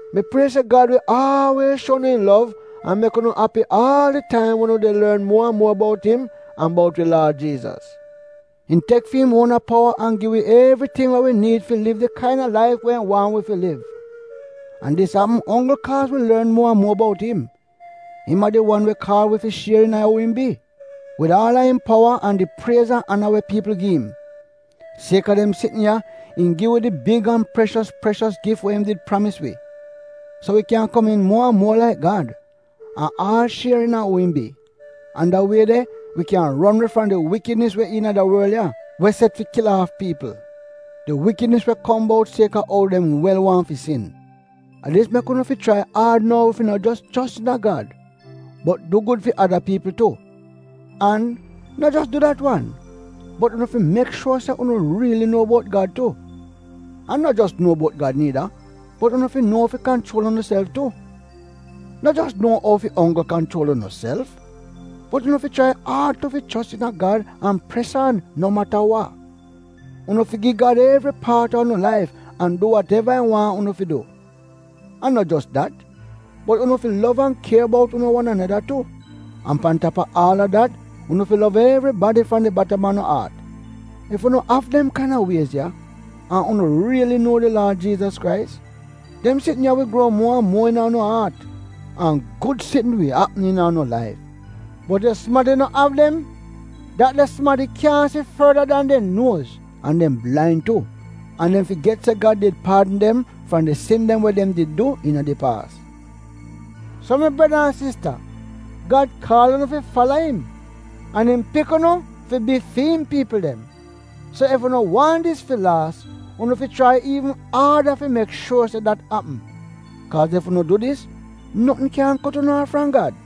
Mi prie se Gad wi aalwiez shuo unu im lov an mek unu api aal di taim wen unu a lorn muo an muo bout im an bout wi Laad Jiizas. Im tek fi im uona powa an gi wi evriting we wi niid fi liv di kaina laif we im waahn wi fi liv. An dis apm onggl kaaz wi lorn muo an muo bout im. Im a di wan we kaal wi fi shier iina uu im bi — wid aal a im powa an di priez an ana we piipl gi im. Sieka dem sitn ya im gi wi di big an preshos preshos gif we im did pramis wi. So, wi kyan komiin muo an muo laik Gad, an aal shier iina uu im bi. An da wie de wi kyan ron we fram di wikidnis we iina da worl ya, we set fi kil aaf piipl. Di wikidnis we kom bout sieka ou dem wel waahn fi sin. A dis mek unu fi chrai aad nou fi no jos chos iina Gad, bot du gud fi ada piipl tu. An no jos du dat wan, bot unu fi mek shuor se unu riili nuo bout Gad tu. An no jos nuo bout Gad niida, bot unu fi nuo ou fi kanchuol unuself tu. No jos nuo ou fi onggl kanchuol unuself, bot unu fi chrai aad tu fi chos iina Gad an pres aan no mata wa. Unu fi gi Gad evri paat a unu laif an du wateva im waahn unu fi du. An no jos dat, bot unu fi lov an kier bout unu wan aneda tu. An pan tap a aal a dat unu fi lov evribadi fram di batam a unu aat. Ef unu av dem kaina wiez ya, an unu riili nuo di Laad Jiizas Krais, dem sitn ya wi gruo muo an muo iina unu aat. An gud sitn wi apm iina unu laif. Bot ef sumadi no av dem, dat de sumadi kyaahn si forda dan dem nuoz an dem blain tu, an dem figet se Gad did paadn dem fram di sin dem we dem did du iina di paas. So mi breda an sista, Gad kaal unu fi fala im. An im pik unu fi bi fi im piipl dem. So ef unu waahn dis fi laas unu fi chrai iivn aada fi mek shuor se dat apm. Kaaz ef unu du dis, notn kyaahn kot unu aaf fram Gad.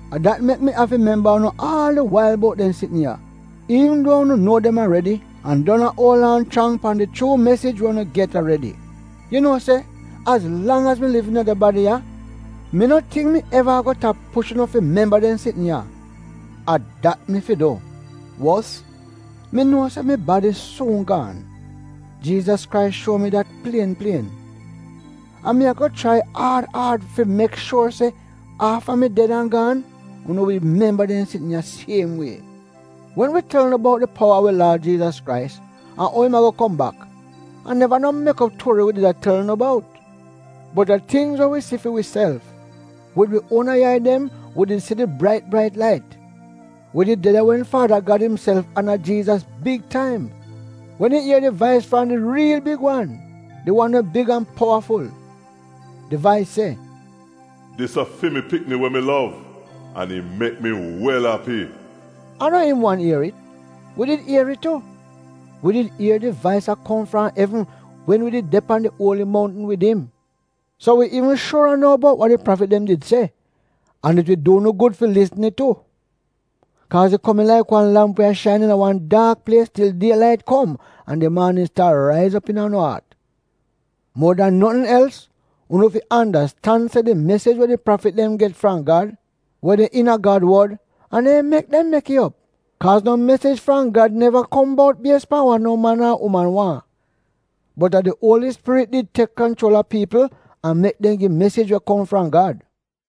A dat mek mi afi memba unu aal di wail bout dem sitn ya; iivn duo unu nuo dem aredi an don a uol aan chrang pan di chuu mesij we unu get aredi. Yu nuo se az lang az mi liv iina da badi ya mi no tingk mi ago eva tap push unu fi memba dem sitn ya. A dat mi fi du. Wos, mi nuo se mi badi suun gaan. Jiizas Krais shuo mi dat plien plien. An mi ago chrai aad aad fi mek shuor se afta mi ded an gaan unu wi memba dem sitn ya siem wie. Wen wi tel unu bout di powa a wi Laad Jiizas Krais an ou im ago kom bak, a neva no mek op tuori wi did a tel unu bout. Bot a tingz we wi si fi wiself. Wid wi uona yai dem wi did si di brait brait lait. Wi did de de wen Faada Gad imself ana Jiizas big taim, wen im ier di vais fram di riil big Wan — di wan we big an powaful. Di vais se, “Dis a fi mi pikni we mi lov an im mek mi wel api.” A no im wan ier it — wi did ier it tu. Wi did ier di vais a kom fram evn wen wi did de pan di uoli moutn wid im. So wi iivn shuora nou bout wa di prafit dem did se, an it wi du unu gud fi lisn it tu. Kaaz it komiin laik wan lamp we a shain iina wan daak plies til die lait kom an di maanin staar raiz op iina unu aat. Muo dan notn els, unu fi andastan se di mesij we di prafit dem get fram Gad, we de iina Gad wod, a neehn mek dem mek it op. Kaaz no mesij fram Gad neva kom bout bies pan we no man ar uman waahn, bot a di Uoli Spirit did tek kanchuol a piipl an mek dem gi mesij we kom fram Gad.